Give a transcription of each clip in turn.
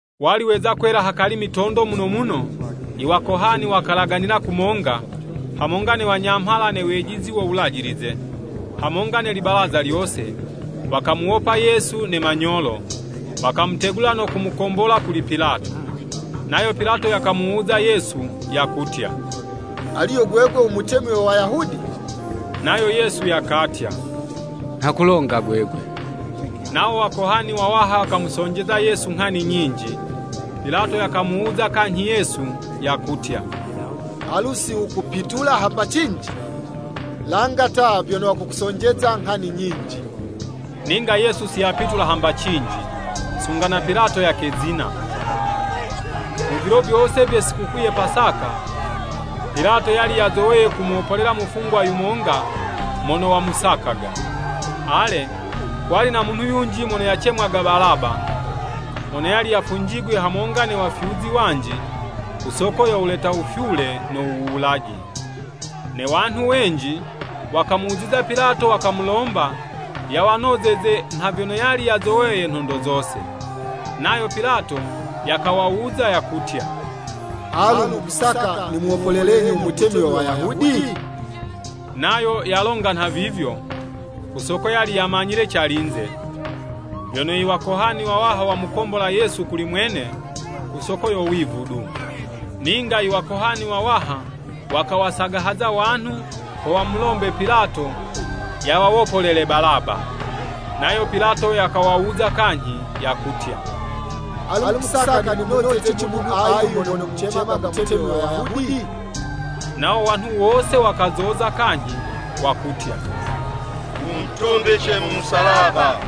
Wali weza kwela hakali mitondo muno muno, iwakohani wakalaganila kumonga, hamonga ne wanyamhala ne wejizi wo Wulajilize, hamonga ne libalaza lyose, wakamuwopa Yesu ne manyolo, wakamutegula no kumukombola kuli Pilato. Nayo Pilato yakamuwuza Yesu, yakutya, “Alu yo gwegwe u Mutemi we Wayahudi?” Nayo Yesu yakatya, “Nha kulonga gwegwe.” Nawo Wakohani wawaha wakamusonjeza Yesu nghani nyinji. Pilato yakamuwuza kanyhi Yesu, yakutya, “Alu si wukupitula hamba cinji? Langa ta vyono wakukusonjeza nghani nyinji.” Ninga Yesu siyapitula hamba cinji, sunga na Pilato yakezina. Mu vilo vyose vye Sikukuu ye Pasaka, Pilato yali yazoweye kumuwopolela mufungwa yumonga mono wamusakaga. Ale, kwali na munhu yunji mono yacemwaga Balaba, mono yali yafunjigwe hamonga ne wafyuzi wanji ku soko yo wuleta wufyule no wuwulaji. Ne wanhu wenji wakamuziza Pilato wakamulomba yawanozeze nha vyono yali yazoweye nhondo zose. Nayo Pilato yakawawuza, yakutya, “Alu, mukusaka nimuwopolelenyi u Mutemi we Wayahudi?” Nayo yalonga nhavivyo, ku soko yali yamanyile calinze, vyono iwakohani wawaha wamukombola Yesu kuli mwene ku soko yo wivu du. Ninga i wakohani wawaha wakawasagahaza wanhu ho wamulombe Pilato yawawopolele Balaba. Nayo Pilato yakawawuza kanyhi, yakutya, “Alu mukusaka nimunozeci munhu ayu mono mumucemaga Mutemi we Wayahudi?” Nawo wanhu wose wakazoza kanyhi, wakutya, “Wumutumbice mu musalaba!”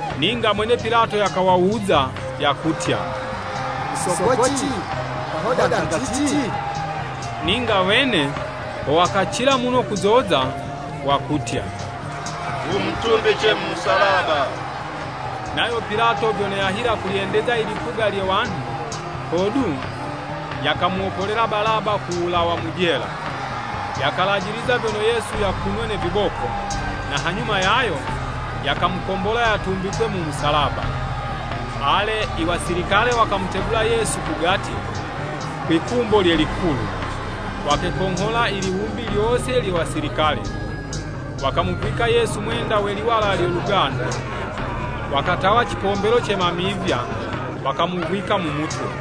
Ninga mwene Pilato yakawawuza, yakutya, “Ku sokoci? Kahodanga cici?” Ninga wene ho wakacila muno kuzoza, wakutya, “Wumutumbice mu musalaba!” Nayo Pilato vyono yahila kulyendeza i lipuga lye wanhu, hodu, yakamuwopolela Balaba ku wulawa mu jela. Yakalajiliza vyono Yesu yakunwe ne viboko, na hanyuma yayo, yakamukombola yatumbikwe mu musalaba. Ale, iwasilikale wakamutegula Yesu kugati, kwi'kumbo lye likulu, wakekonghola i liwumbi lyose lye wasilikale. Wakamuvwika Yesu mwenda we liwala lyo lugandu, wakatawa cipombelo ce mamivya, wakamuvwika mu mutwe.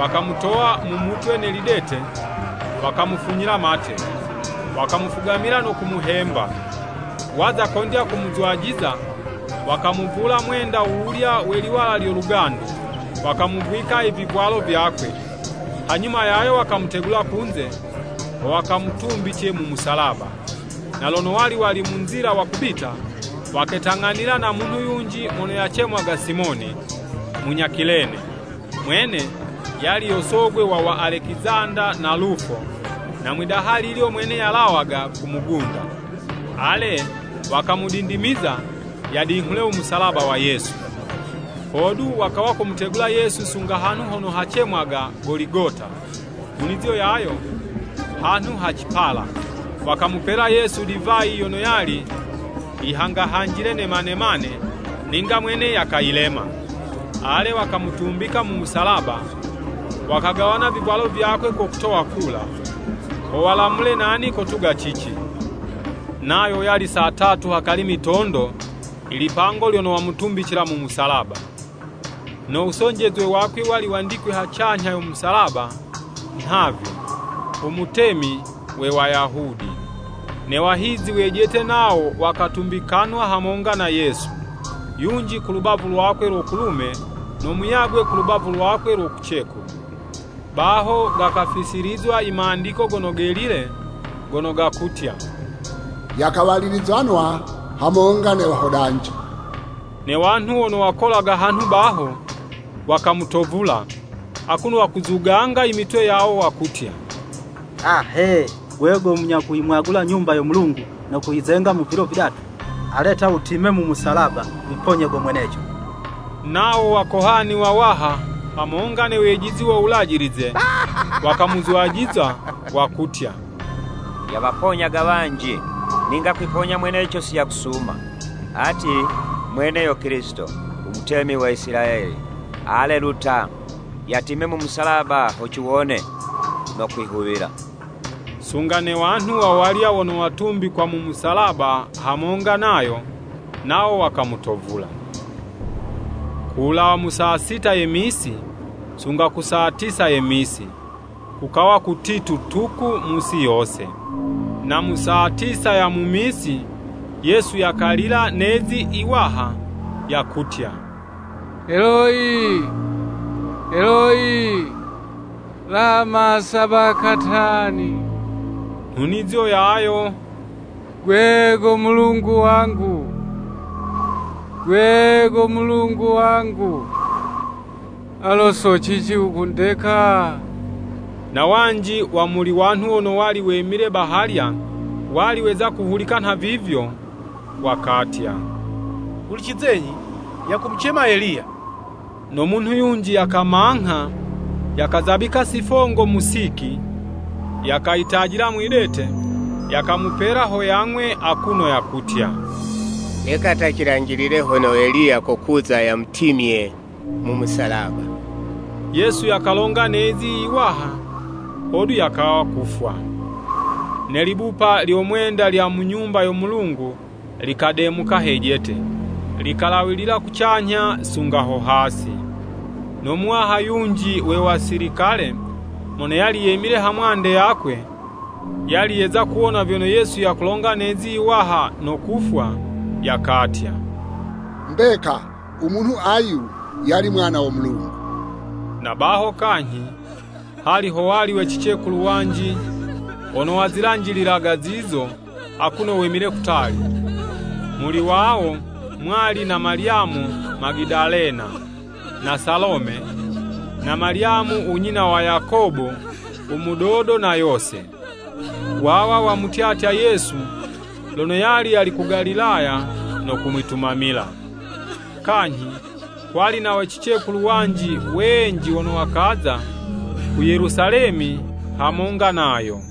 Wakamutowa mu mutwe ne lidete, wakamufunyila mate, wakamufugamila no kumuhemba. Waza kondya kumuzwajiza, wakamuvula mwenda wuwulya we liwala lyo lugandu, wakamuvwika i vivwalo vyakwe, hanyuma yayo wakamutegula kunze, ho wakamutumbice mu musalaba. Na lono wali wali mu nzila wakubita, waketang'anila na munhu yunji mono kacemwaga Simoni, munya Kilene. Mwene yali yo sogwe wa wa Alekizanda na Lufo, na mwidaha lilyo mwene yalawaga ku mugunda. Ale wakamudindimiza, yadinghule umusalaba wa Yesu. Hodu wakawa kumutegula Yesu sunga hanhu hono hacemwaga Goligota, nhunizo yayo “Hanhu ha cipala.” Wakamupela Yesu divayi yono yali yihangahanjile ne manemane, ninga mwene yakayilema. Ale wakamutumbika mu musalaba, wakagawana vivwalo vyakwe ko kutowa kula, ho walamule nani kotuga cici. Nayo yali saa tatu hakali mitondo ilipango lono wamutumbicila mu musalaba. No wusonjezwe wakwe wali wandikwe hacanyha yo musalaba, nhavi, “U mutemi we Wayahudi.” Ne wahizi wejete nawo wakatumbikanwa hamonga na Yesu. Yunji ku lubavu lwakwe lo kulume no muyagwe ku lubavu lwakwe lo kucekulu. [ Baho gakafisilizwa i Mandiko Gono Gelile gono gakutya, “Yakawalilizanwa hamonga ne Wahodanji.”] Ne wanhu wono wakolaga hanhu baho, wakamutovula, akuno wakuzugunza i mitwe yawo wakutya, “A, he! Gwe go munya kuyimwagula Nyumba yo Mulungu no kuyizenga mu vilo vidatu! Ale ta, wutime mu musalaba, wiponye go mweneco!” Nawo wakohani wawaha hamonga ne wejizi wo Wulajilize, wakamuzwajiza wakutya, “Yawaponyaga wanji, ninga kwiponya mweneco siyakusuma! Ati mwene yo Kilisito, u Mutemi wa Isilayeli! Ale, lu ta, yatime mu musalaba ho ciwone no kwihuwila.” Sunga ne wanhu wawalya wono watumbikwa mu musalaba hamonga nayo, nawo wakamutovula. Ku wulawa mu saa sita ye misi, sunga ku saa tisa ye misi, kukawa kutitu tuku mu'si yose. Na mu saa tisa ya mu misi, Yesu yakalila ne'zi iwaha yakutya, “Eloyi, Eloyi, lama Sabakatani.” Nhunizo yayo, “Gwe go Mulungu wangu, Gwe go Mulungu wangu, alu so cici wukundeka?” Na wanji wa muli wanhu wono wali wemile bahalya wali weza kuhulika nhavivyo, wakatya “Hulicizenyi! Yakumucema Eliya.” No munhu yunji yakamangha, yakazabika sifongo mu Siki, yakayitajila mwidete yakamupela ho yang'we akuno yakutya, “Leka ta cilanjilile hono Eliya kokuza yamutimye mu musalaba.” Yesu yakalonga ne'zi iwaha, hodu yakawa kufwa. Ne libupa lyo mwenda lya mu Nyumba yo Mulungu likademuka hejete, likalawilila kucanyha sunga ho hasi. No muwaha yunji we wasilikale mono yali yemile ha mwande yakwe, yali yeza kuwona vyono Yesu yakulonga ne'zi yiwaha no kufwa, yakatya, “Mbeka umunhu ayu, yali Mwana wo Mulungu!” Na baho kanyhi, hali howali we cicekulu wanji wono wazilanjililaga zizo akuno wemile kutali, muli wawo mwali na Malyamu Magadalena, na Salome, na Malyamu unyina wa Yakobo u mudodo na Yose. Wawa wamutyatya Yesu lono yali yali ku Galilaya no kumwitumamila. Kanyhi kwali na we cicekulu wanji wenji wono wakaza ku Yelusalemi hamonga nayo.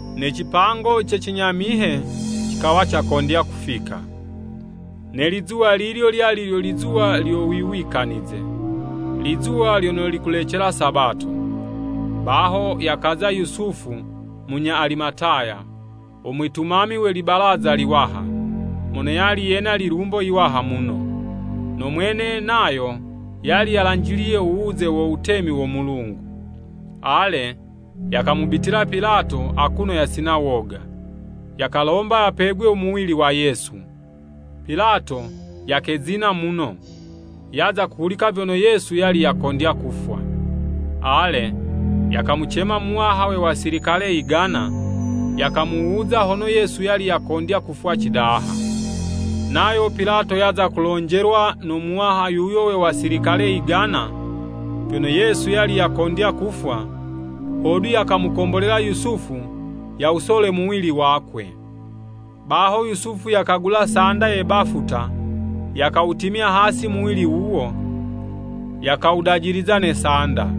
Ne cipango ce cinyamihe cikawa cakondya kufika. Ne lizuwa lilyo lyali lyo lizuwa lyo Wuwikanize, lizuwa lyono likulecela Sabato. Baho yakaza Yusufu munya Alimataya, umwitumami we Libalaza liwaha, mono yali yena lilumbo yiwaha muno. No mwene nayo yali yalanjiliye uwuze wo Wutemi wo Mulungu. Ale, yakamubitila Pilato akuno yasina woga, yakalomba yapegwe u muwili wa Yesu. Pilato yakezina muno, yaza kuhulika vyono Yesu yali yakondya kufwa. Ale, yakamucema muwaha we wasilikale yigana, yakamuwuza hono Yesu yali yakondya kufwa cidaha. Nayo Pilato yaza kulonjelwa no muwaha yuyo we wasilikale yigana, vyono Yesu yali yakondya kufwa, hodu yakamukombolela Yusufu yawusole muwili wakwe. Baho Yusufu yakagula sanda ye bafuta, yakawutimya hasi muwili wuwo, yakawudajiliza ne sanda.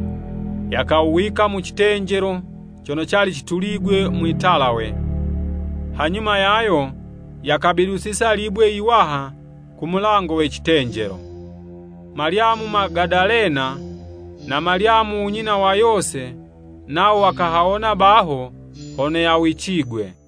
Yakawuwika mu citenjelo cono cali cituligwe mwi'talawe, hanyuma yayo yakabidusiza libwe yiwaha ku mulango we citenjelo. Malyamu Magadalena na Malyamu unyina wa Yose nawo wakahawona baho hono yawicigwe.